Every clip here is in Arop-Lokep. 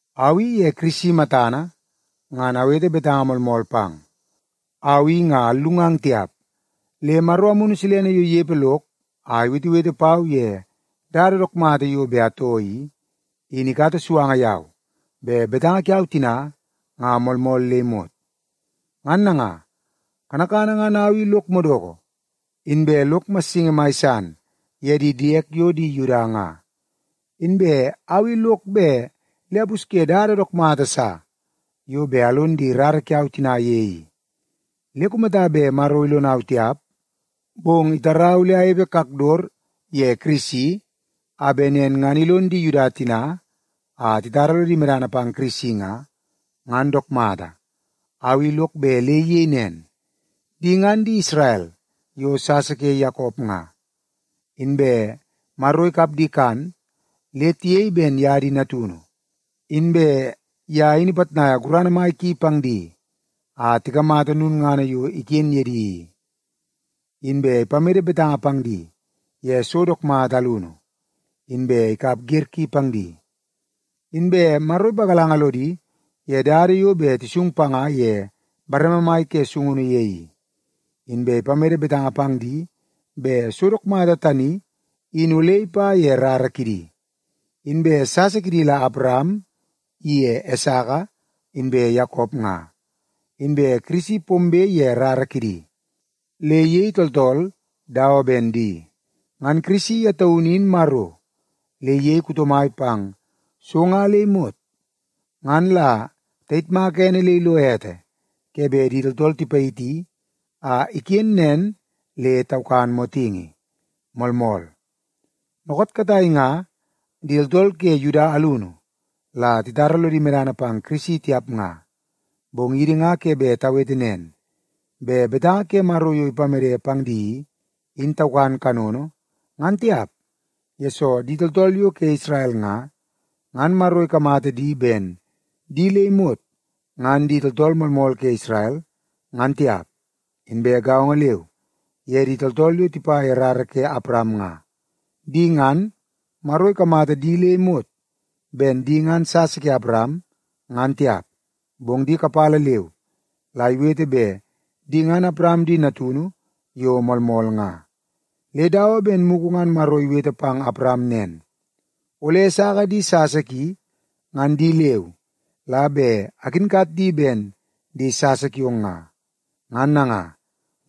Au i ye Kirisi matana ngan awete betanga moolmool pang. Au i nga allungang tiap, le Maro Amunu Silene yo inepe lok a iwetewete pau ye dada dook mata yo bet atoo i, in ikata suanga yau bet betanga kiau tina ngan moolmool le imot. Ngan nanga, kanakana ngan au i lok madoko inbe lok massingi mai san ye di diek yo di Yuda nga. Inbe au i lok bet le apusye dada dook mata sa yo bet alon di rara kiau tina ye i. Le kumata bet Maro ilonau tiap, bong itarau le anepe kakdot ye Kirisi, a bet nen ngan ilon di Yuda tina a titara lodi medana pang Kirisi nga, ngan dook mata. Au i lok bet le iyei nen. Di ngan di Isrel yo sasa ke Yakop nga. Inbe Maro ikap di kan le tiyei ben ye di natunu, inbe ye in ipitnaia gurana mai ki pang di a tikamata lulngana yo iken ye di i. Inbe ipamede betanga pang di ye so dook mata alunu, inbe ikap wer ki pang di. Inbe Maro ipagalanga lodi ye dada yo bet tisung panga ye bareme mai ke sungunu ye i, inbe ipamede betanga pang di bet so dook mata tani in ole ipa ye rara kidi. Inbe sasa kidi la Awaram iye Esaka inbe Yakop nga. Inbe Kirisi pombe ye rara kidi, le iyei tooltool dawa ben di. Ngan Kirisi ye taunu in Maro, le iyei kuto mai pang so nga le imot. Ngan la tayitmaka ene le ilo ete ke bet di tooltool tipayiti a iken nen le taukan motingi. Moolmool. Dookoot katai nga di tooltool ke Yuda alunu la titara lodi medana pang Kirisi tiap nga, bong idi nga ke bet tawete nen, bet betanga ke Maro yo ipamede pang di i, in taukan kanono nga tiap, yesoo di tooltool yo ke Isrel nga, ngan Maro ikamata di ben di le imot ngan di tooltool moolmool ke Isrel, ngan tiap. Inbe gaongo leu ye di tooltool yo tipa ye rara ke Awaram nga. Di ngan, Maro ikamata di le imot ben di ngan sasa ke Awaram, ngan tiap, bong di kapala leu la iwete bet di ngan Awaram di natunu yo moolmool nga. Le dawa ben mugu ngan Maro iwete pang Awaram nen, “Ole Esaka di sasa ki, ngan di leu la bet akinkat di ben di sasa kiong nga.” Ngan nanga,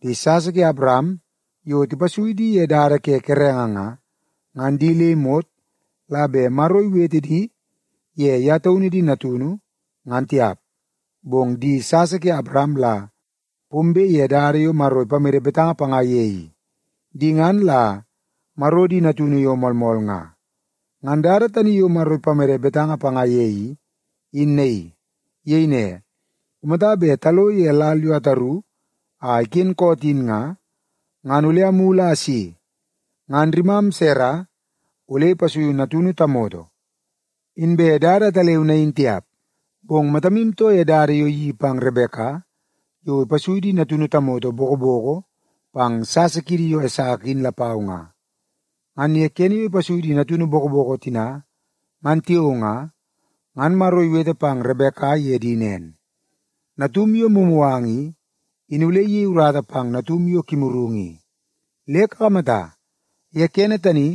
di sasa ke Awaram yo tipasui di ye dada ke kerenge nga, ngan di le imot la bet Maro iwete di ye ye taunu di natunu, ngan tiap. Bong di sasa ke Awaram la pombe ye dada yo Maro ipamede betanga panga ye i, di ngan la Maro di natunu yo moolmool nga. Ngan dada tani yo Maro ipamede betanga panga ye i, in naii. Iyei ne, “Kumata bet talo ye lal yo ataru a iken koot in nga, ngan ole amulu a asi, ngan rimam Sara ole ipasuiu natunu tamoto.” Inbe dada ataleu nain tiap, bong matamu too ye dada yo iyeii pang Rebeka yo ipasui di natunu tamoto bokoboko pang sasa kiidi yo Esaka in lapau nga. Ngan ye kene yo ipasui di natunu bokoboko tina ngan tiao nga, ngan Maro iwete pang Rebeka ye di nen, “Natum yo mumuganga i, in ole iyei urata pang natum yo kimurungu i.” Le kakamata, ye kene tani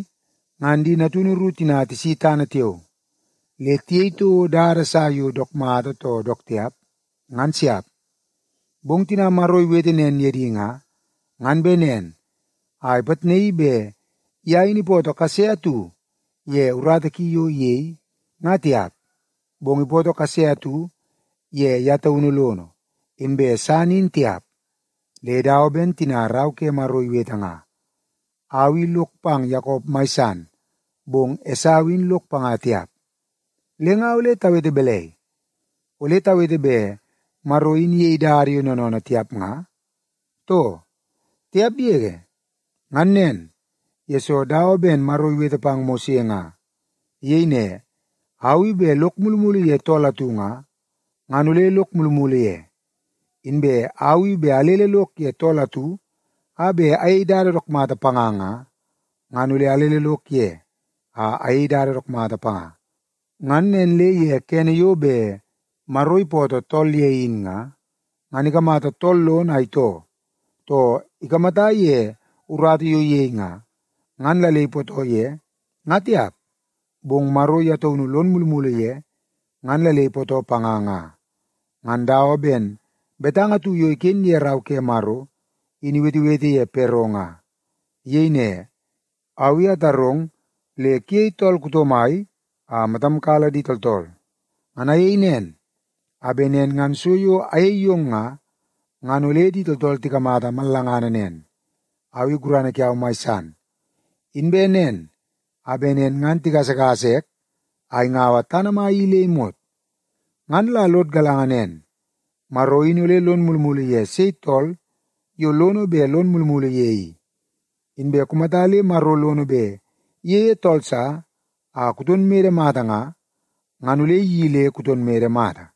ngan di natunu ru tina tisi tana tiao, le tiyei toko dada sa yo dook mata too dook tiap, ngan siap. Bong tina Maro iwete nen ye di nga, ngan bet nen a ipitnaii bet ye in ipootoo kase atu ye urata ki yo iyei, nga tiap, bong ipootoo kase atu ye ye taunu lono, inbe san in tiap. Le dawa ben tina Rau ke Maro iwete nga, “Au i lok pang Yakop mai san, bong Esau in lok panga tiap.” Le nga ole tawete balai? Ole tawete bet Maro in iyei dada yo noonoonoo tiap nga, too? Tiap yege! Ngan nen, yesoo dawa ben Maro iwete pang Mose nga. Iyei ne, “Au i bet lok mulumulu ye tool atu nga, ngan ole lok mulumulu ye. Inbe au i bet alele lok ye tool atu a bet ayei dada dook mata panga nga, ngan ole alele lok ye a ayei dada dook mata panga.” Ngan nen le ye kene yo bet Maro ipootoo tool ye in nga, ngan ikamata tool lono a itoo, too ikamata ye urata yo iyei nga, ngan la le ipootoo ye, nga tiap. Bong Maro ye taunu lon mulumulu ye ngan la le ipootoo panga nga. Ngan dawa ben betanga atu yo iken ye Rau ke Maro, in iwetewete ye Pero nga. Iyei ne, “Au i atarong le kuyei tool mai a matam kala di tooltool. Ngan ayei nen, a bet nen ngan so yo ayei yong nga, ngan ole di tooltool tikamata mallangana nen, au i gurana kiau mai san. Inbe nen, a bet nen ngan tigasagasa ek a ingaua tana mai i le imot.” Ngan la lod galanga nen, Maro in ole lon mulumulu ye sei tool yo lono bet lon mulumulu ye i. Inbe kumata le Maro lono bet iyeie tool sa a kuton mede mata nga, ngan ole iyeii le kuton mede mata.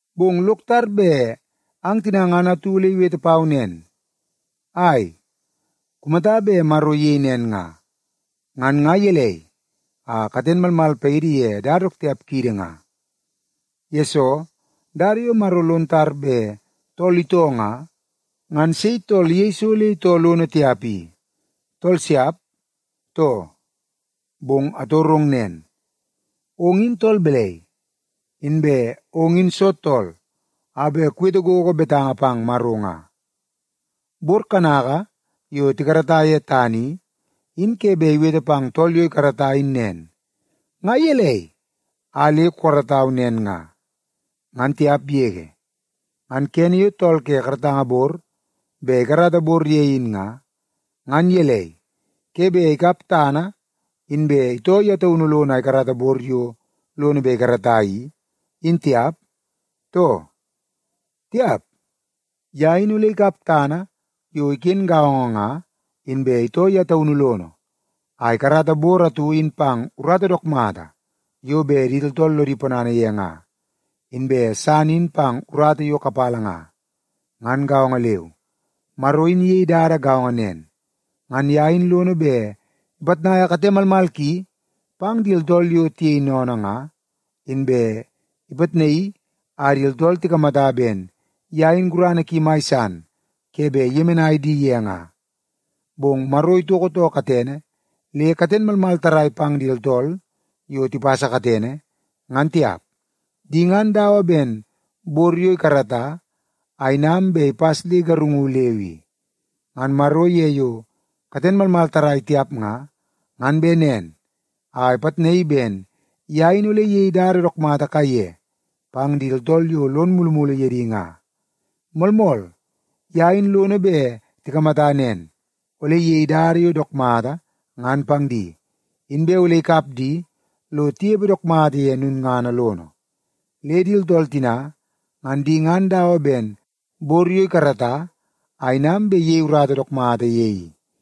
Bong lok tar bet ang tina ngan atu ole iwete pau nen, “Ai, kumata bet Maro iyei nen nga, ngan nga gelei a katen malmal paidi ye dada dook tiap kiidi nga? Yesoo, dada yo Maro lon tar bet tool itoo nga, ngan sei tool iyei so le itoo lono tiap i? Tool siap, too?” Bong atorong nen, ong in tool balai, inbe ong in soo tool a bet kuwete gogo betanga pang Maro nga? Bor yo tikarata ye tana i, in ke bet iwete pang tool yo ikarata in nen, “Nga gelei a le kukaratau nen nga?” ngan tiap yege. Ngan kene yo tool ke karatanga bor bet ikarata bor ye in nga, ngan gelei, ke bet ikap tana inbe itoo ye taunu lono a ikarata bor yo lono bet ikarata i, in tiap, too? Tiap! Ye in ole ikap tana yo iken gaongo nga, inbe itoo ye taunu lono a ikarata bor atu in pang urata dook mata yo bet di tooltool lodi ponana ye nga, inbe san in pang urata yo kapala nga. Ngan gaongo leu, Maro in iyei dada gaongo nen. Ngan ye in lono bet ipitnaia kate malmal ki pang di tooltool yo tiyei sennene nga, inbe ipitnaii a di tooltool tikamata ben ye in gurana ki mai san ke bet iyemenai di ye nga. Bong Maro itoko too katene le katen malmal tarrai pang di tooltool yo tipasa katene, ngan tiap. Di ngan dawa ben bor yo ikarata a inam bet ipas le igarungu leu i. Ngan Maro ye yo katen malmal tarrai tiap nga, ngan bet nen a ipitnaii ben ye in ole iyei dada dook mata kaiye pang di tooltool yo lon mulumulu ye di nga. Moolmool, ye in lono bet tikamata nen; ole iyei dada yo dook mata ngan pang di, inbe ole ikap di lo tinepe dook mata ye lulngana lono. Le di tooltool tina, ngan di ngan dawa ben bor yo ikarata a inam bet iyei urata dook mata ye i.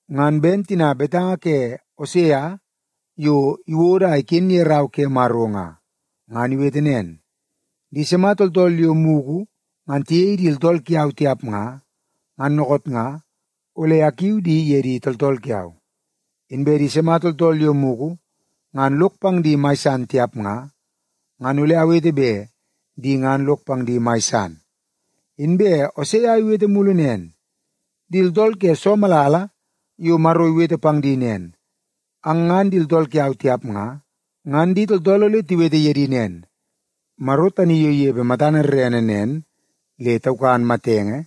Ngan ben tina betanga ke Osea yo iwodo a iken ye Rau ke Maro nga. Ngan iwete nen, “Di sima tooltool yo mugu ngan tiyei di tooltool kiau tiap nga, ngan dookoot nga ole akiu di ye di tooltool kiau. Inbe di sima tooltool yo mugu ngan lok pang di mai san tiap nga, ngan ole awete bet di ngan lok pang di mai san.” Inbe Osea iwete mulu nen, “Di tooltool ke soo malala yo Maro iwete pang di nen, ‘Ang ngan di tooltool kiau tiap nga,’ ngan di tooltool ole tiwete ye di nen, ‘Maro tani yo inepe matana rerene nen le taukan matenge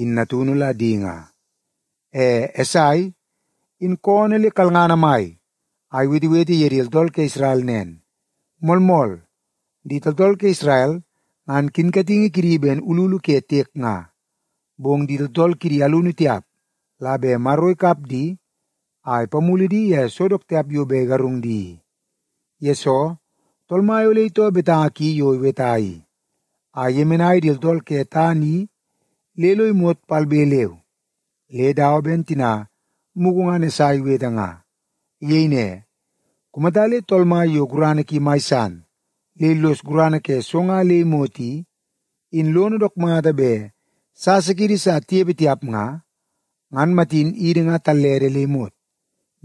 in natunu la di nga.’” E Esai, in koonoo le kalngana mai a iwetewete ye di tooltool ke Isrel nen, “Moolmool, di tooltool ke Isrel ngan kinkatingi kidi ben ululu ke tiek nga, bong di tooltool kidi alunu tiap la bet Maro ikap di a ipamulu di ye so dook tiap yo bet igarungu di i. Yesoo, Tool Mai ole itoo betanga ki yo iweta i, a iyemenai di tooltool ke tana i le lo imot palbe leu.” Le dawa ben tina mugu ngan Esai iwete nga. Iyei ne, “Kumata le Tool Mai yo gurana ki mai san le illos gurana ke so nga le imot i, in lono dook mata bet sasa kiidi sa tinepe tiap nga, ngan matin idi nga tallede le imot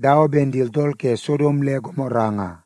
dawa ben di tooltool ke Sodom le Gomora nga.”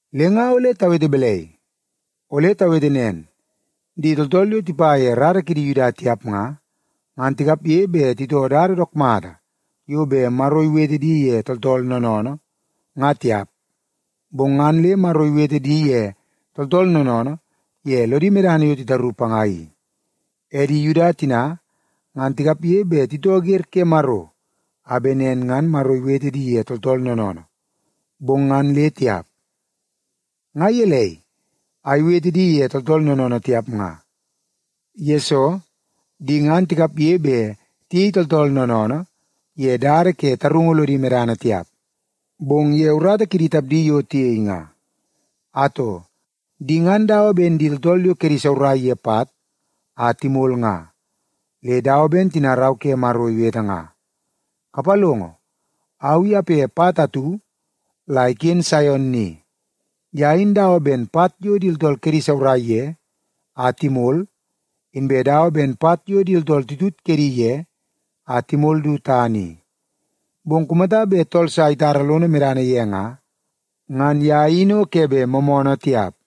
Le nga ole tawete balai? Ole tawete nen, di tooltool yo tipa ye rara kidi Yuda tiap nga, ngan tikapge bet titoo dada dook mata yo bet Maro iwete di ye tooltool noonoonoo, nga tiap, bong ngan le Maro iwete di ye tooltool noonoonoo ye lodi medana yo titaru panga i. E di Yuda tina ngan tikapge bet titoo wer ke Maro a bet nen ngan Maro iwete di ye tooltool noonoonoo, bong ngan le tiap. Nga gelei a iwete di ye tooltool noonoonoo tiap nga? Yesoo, di ngan tikapge bet tiyei tooltool noonoonoo ye dada ke tarungu lodi medana tiap, bong ye urata kidi tapdi yo tiyei nga. Atoo, di ngan dawa ben di tooltool yo kedi saurai ye pat a timol nga. Le dawa ben tina Rau ke Maro iwete nga, “Kapalongo, au i ape pat atu la iken Saion ni. Ye in dawa ben pat yo di tooltool kedi isaurai ye a timol, inbe dawa ben pat yo di tooltool titut kedi ye a timol du tana i. Bong kumata bet tool sa itara lono medana ye nga, ngan ye in o ke bet moomoonoo tiap.”